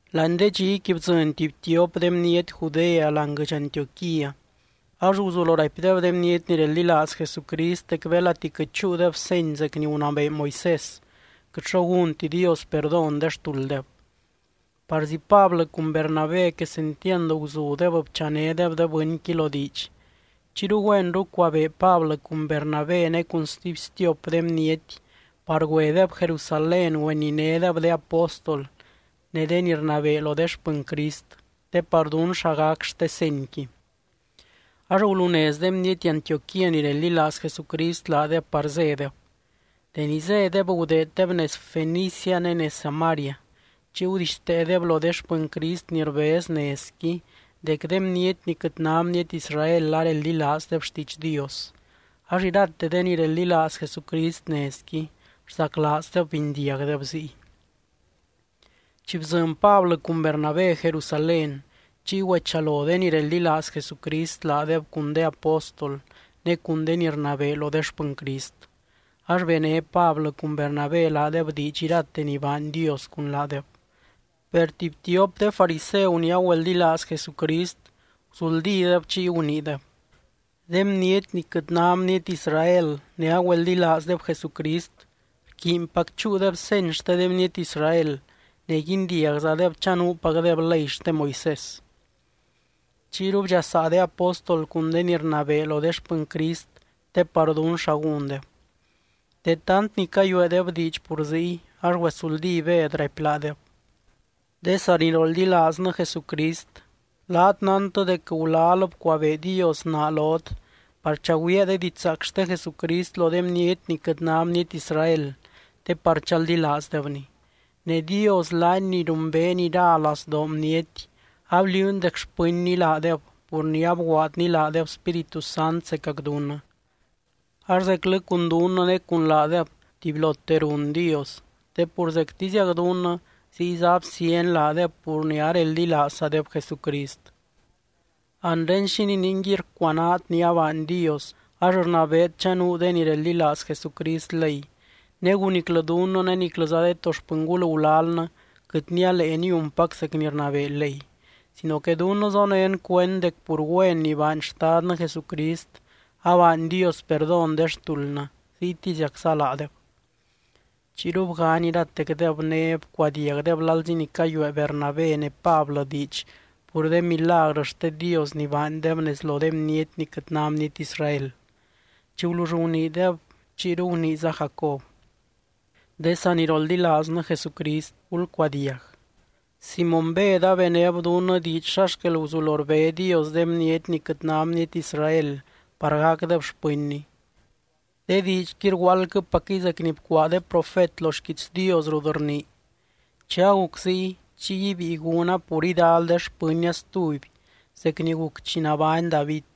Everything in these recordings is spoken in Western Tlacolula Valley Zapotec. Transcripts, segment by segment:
Láani de dxiqui bdzɨny tuby tiop de bniety Judea láani guɨdx Antioquía. Ax guzulo raipdeb de bniety ni reldilaaz Jesucrist dec belati quɨt chúudeb seny zec ni gunabee Moisés, quɨt xo gúnti Dios perdón de xtulddeb. Parzi Pablɨ cun Bernabé quesentiand guzudeb bchanédeb de bɨnqui lo diidx. Chiyru güenru cuabee Pablɨ cun Bernabé ne cun stuby stiop de bniety par güedeb Jerusalén güeninédeb de apóstol ne de ni rnabee lo de xpɨny Crist, te par dún xa gac xte senyqui. Ax gulunez de bniety Antioquía ni reldilaaz Jesucrist laadeb par zédeb. Deni zédeb gudeeddeb nez Fenicia ne nez Samaria. Chiy gudixteedeb lo de xpɨny Crist ni rbez nezqui dec de bniety ni quɨt ná bniety Israel areldilaazdeb xtiidx Dios. Ax irate de ni reldilaaz Jesucrist nezqui, rzaclaazdeb bindiagdeb ziy. Chi bdzɨny Pablɨ cun Bernabé Jerusalén, chiy güechalo de ni reldilaaz Jesucrist laadeb cun de apóstol ne cun de ni rnabee lo de xpɨny Crist. Ax bené Pablɨ cun Bernabé laadeb diidx irate ni baany Dios cun laadeb. Per tuby tiop de fariseu ni agüeldilaaz Jesucrist, guzuldídeb chiy guniideb: —De bniety ni quɨt ná bniety Israel ne agüeldilaazdeb Jesucrist, rquiinpac chúudeb seny xte de bniety Israel ne guindiagzadeb chanuupacdeb ley xte Moisés. Chiyru bdxasaa de apóstol cun de ni rnabee lo de xpɨny Crist te par dún xa gúndeb. De tant ni cayueedeb diidx pur ziy, ax güesuldí Bed raipy laadeb: —De saniroldilaaznɨ Jesucrist, laat nántɨ dec gulal bcuabee Dios naa lot par chagüiaa de didxzaac xte Jesucrist lo de bniety ni quɨt ná bniety Israel te par chaldilaazdebny. Ne Dios laany ni rumbeeny ira lazdoo bniety, abliuuny dec xpɨnny laadeb pur ni abguaadny laadeb Spíritu Sant zecac dunnɨ. Ax zeclɨ cun dunnɨ ne cun laadeb tubylote run Dios, te pur zectiziac dunnɨ ziyza absíany laadeb pur ni areldilaazzadeb Jesucrist. Anre, ¿xínii ninguiy rcuanaat ni abaany Dios ax rnabeet chanuu de ni reldilaaz Jesucrist ley, negu niclɨ dunnɨ ne niclɨza de to xpɨngul gulalnɨ quɨt nialee niunpac zec ni rnabee ley? Sino que dunnɨ zonén cuend dec pur güen ni baany Xtadnɨ Jesucrist, abaany Dios perdón de xtuldnɨ, ziytiziacza laadeb. Chiyru bgany iratecdeb ne bcuadiagdeb lalzi ni cayuee Bernabé ne Pablɨ diidx pur de milagrɨ xte Dios ni baandeb nez lo de bniety ni quɨt ná bniety Israel. Chi gulull guniideb, chiyru guniiza Jacob: —De saniroldilaaznɨ Jesucrist, gulcuadiag: Simóny Bed abenéb dunnɨ diidx xa xquel guzulo rbé Dios de bniety ni quɨt ná bniety Israel par gacdeb xpɨnny. De diidxqui rguaaldquɨpacquɨy zec ni bcuaa de profet lo xquiits Dios rut rnii: Chi aguc ziy, chiy ibíi gúna pur idal de xpɨnnia stuby zec ni guc chi nabány David.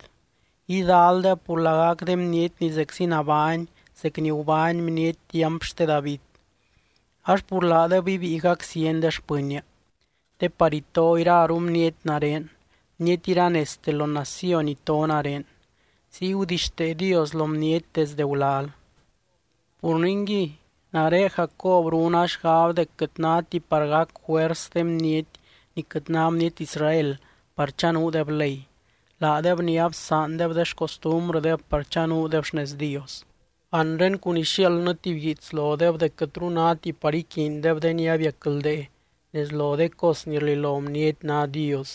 Idaldeb pur lagac de bniety ni zeczi nabány zec ni gubány bniety tiamp xte David, ax pur laadeb ibíi gaczieny de xpɨnnia. Te par ito iraru bniety nare, bniety iranezte lo naciony ito nare. Ziy gudixtee Dios lo bniety desde gulal. ’Pur ningui, nare Jacob runa xgab dec quɨt náti par gac juers de bniety ni quɨt ná bniety Israel par chanuudeb ley, laadeb ni absaandeb de xcostumbrɨdeb par chanuudeb xnez Dios. Anre cun ixiaaldnɨ tuby guiits lodeb dec quɨtru náti par iquiindeb de ni abiacldee nez lo de cos ni rlilo bniety ná dios,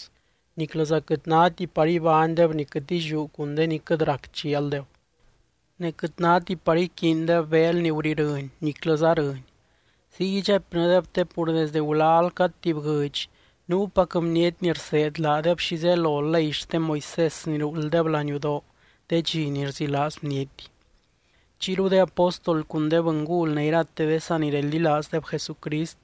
niclɨza quɨt náti par ibánydeb ni quɨt illiú cun de ni quɨt rac chialdeb. Ne quɨt náti par iquiindeb beel ni gurirɨny niclɨza rɨny. Ziy idxaipnɨdeb, te pur desdɨ gulal cad tuby guɨdx nuupac bniety ni rseed laadeb xi zelo ley xte Moisés ni ruulddeb laniudoo de dxi ni rzilaaz bniety. Chiyru de apóstol cun de bɨngul ne irate de sanireldilaazdeb Jesucrist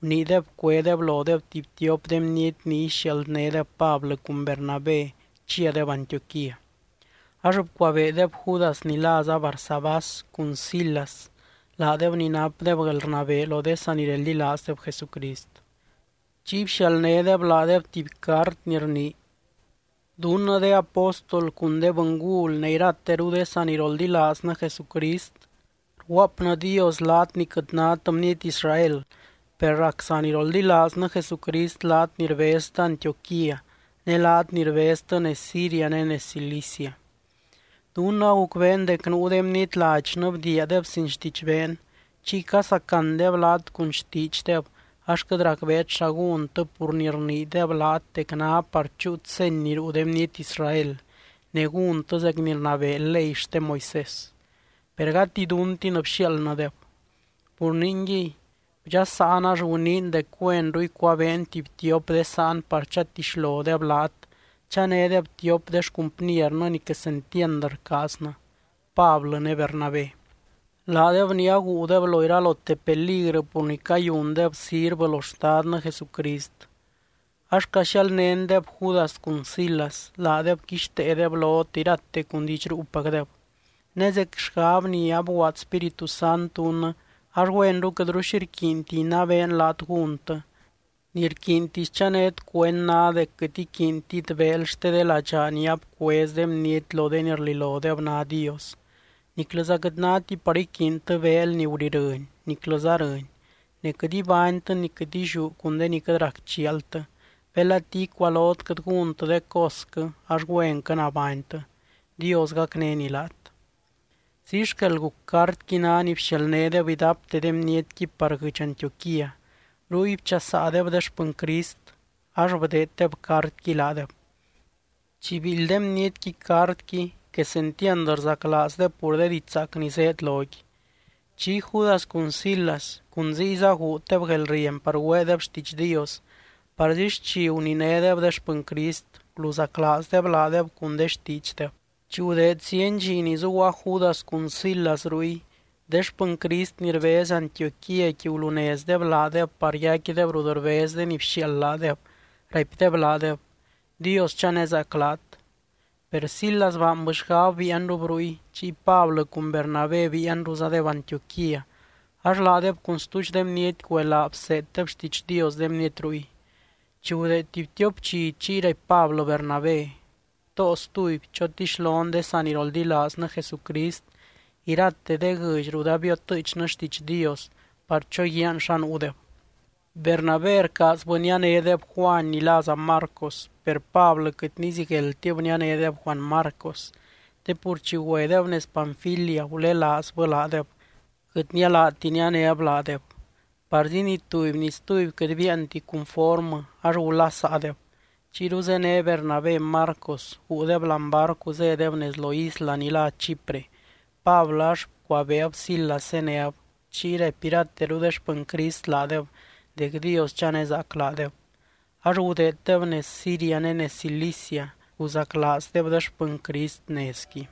guniideb cuédeb lodeb tuby tiop de bniety ni ixialdnédeb Pablɨ cun Bernabé chiadeb Antioquía. Ax bcuabeedeb Judas ni láza Barsabás cun Silas, laadeb ni napdeb guelrnabee lo de sanireldilaazdeb Jesucrist. Chiy bxialdnédeb laadeb tuby cart ni rnii: “Dunnɨ de apóstol cun de bɨngul ne irateru de saniroldilaaznɨ Jesucrist, rguaapnɨdios laat ni quɨt nát bniety Israel, per rac saniroldilaaznɨ Jesucrist laat ni rbeztɨ Antioquía, ne laat ni rbeztɨ nez Siria ne nez Cilicia. Dunnɨ agucbeen dec nuu de bniety ladxnɨ bdiiadeb sin xtidxbeen, chiy casacandeb laat cun xtiidxdeb ax quɨt racbeet xa gúntɨ pur ni rniideb laat dec ná par chúut seny ni ruu de bniety Israel ne gúntɨ zec ni rnabee ley xte Moisés, per gati duntin bxiaaldnɨdeb. Pur ningui, bdxasaan ax guniin dec güenru icuabeen tuby tiop de sáan par chatixlodeb laat, chanédeb tiop de xcumpniernɨ ni quesentiand rcaaznɨ, Pablɨ ne Bernabé, laadeb ni aguudeb lo iralote peligrɨ pur ni cayundeb sirvɨ lo Xtadnɨ Jesucrist. Ax caxialdnéndeb Judas cun Silas, laadeb quixteedeb lot irate cun diidx ruupacdeb. Ne zec xgab ni abguaad Spíritu Sant dunnɨ, ax güenru quɨtru xi rquiinti inabeen laat gúntɨ, ni rquiintisy chanét cuend ná dec quɨt iquiintit beel xte de ladxaa ni abcuez de bniety lo de ni rlilodeb ná dios, niclɨza quɨt náti par iquiintɨ beel ni gurirɨny niclɨza rɨny, ne quɨt ibánytɨ ni quɨt illiú cun de ni quɨt rac chialtɨ. Belati icualot quɨt gúntɨ de cosquɨ ax güenquɨ nabánytɨ. Dios gacnény laat.” Ziy xquel guc, cartqui ná ni bxialdnédeb idapte de bnietqui par guɨdx Antioquía. Ruy bchasaadeb de xpɨny Crist, ax bdeeddeb cartqui laadeb. Chi biildy de bnietqui cartqui, quesentiand rzaclaazdeb pur de diidx zaac ni zéed loqui. Chiy Judas cun Silas, cun ziyza guuddeb guelrieny par güeedeb xtiidx Dios parzi xchi guninédeb de xpɨny Crist, guluzaclaazdeb laadeb cun de xtiidxdeb. Chi gudeed zieny dxi ni zuguaa Judas cun Silas ruy, de xpɨny Crist ni rbez Antioquíaqui gulunezdeb laadeb par yaicquideb rut rbez de ni bxiaald laadeb, raipdeb laadeb: “Dios chanezaac laat.” Per Silas baanbɨ xgab biianrub ruy. Chiy Pablɨ cun Bernabé biianruzadeb Antioquía, ax laadeb cun stuudx de bniety güelaa bseeddeb xtiidx Dios de bniety ruy. Chi gudeed tuby tiop dxi, chiy raipy Pablɨ Bernabé: —Too stuby, chotixlon de saniroldilaaznɨ Jesucrist irate de guɨdx rut abiotɨɨchnɨ xtiidx Dios, par choguiaan xa nuudeb. Bernabé rcaazbɨ nianédeb Juany ni láza Marcos. Per Pablɨ quɨt nizigueldtib nianédeb Juany Marcos, te pur chi güedeb nez Panfilia gulelaazbɨ laadeb, quɨt nialaati nianéb laadeb. Parzi ni tuby ni stuby quɨt biianti cunformɨ, ax gulasaadeb. Chiyru zéne Bernabé Marcos, guudeb láani barcu zédeb nez lo isla ni lá Chipre. Pablɨ ax bcuabeeb Silas zéneb, chiy raipy irateru de xpɨny Crist laadeb dec Dios chanezaac laadeb. Ax gudeeddeb nez Siria ne nez Cilicia, rguzaclaazdeb de xpɨny Crist nezqui.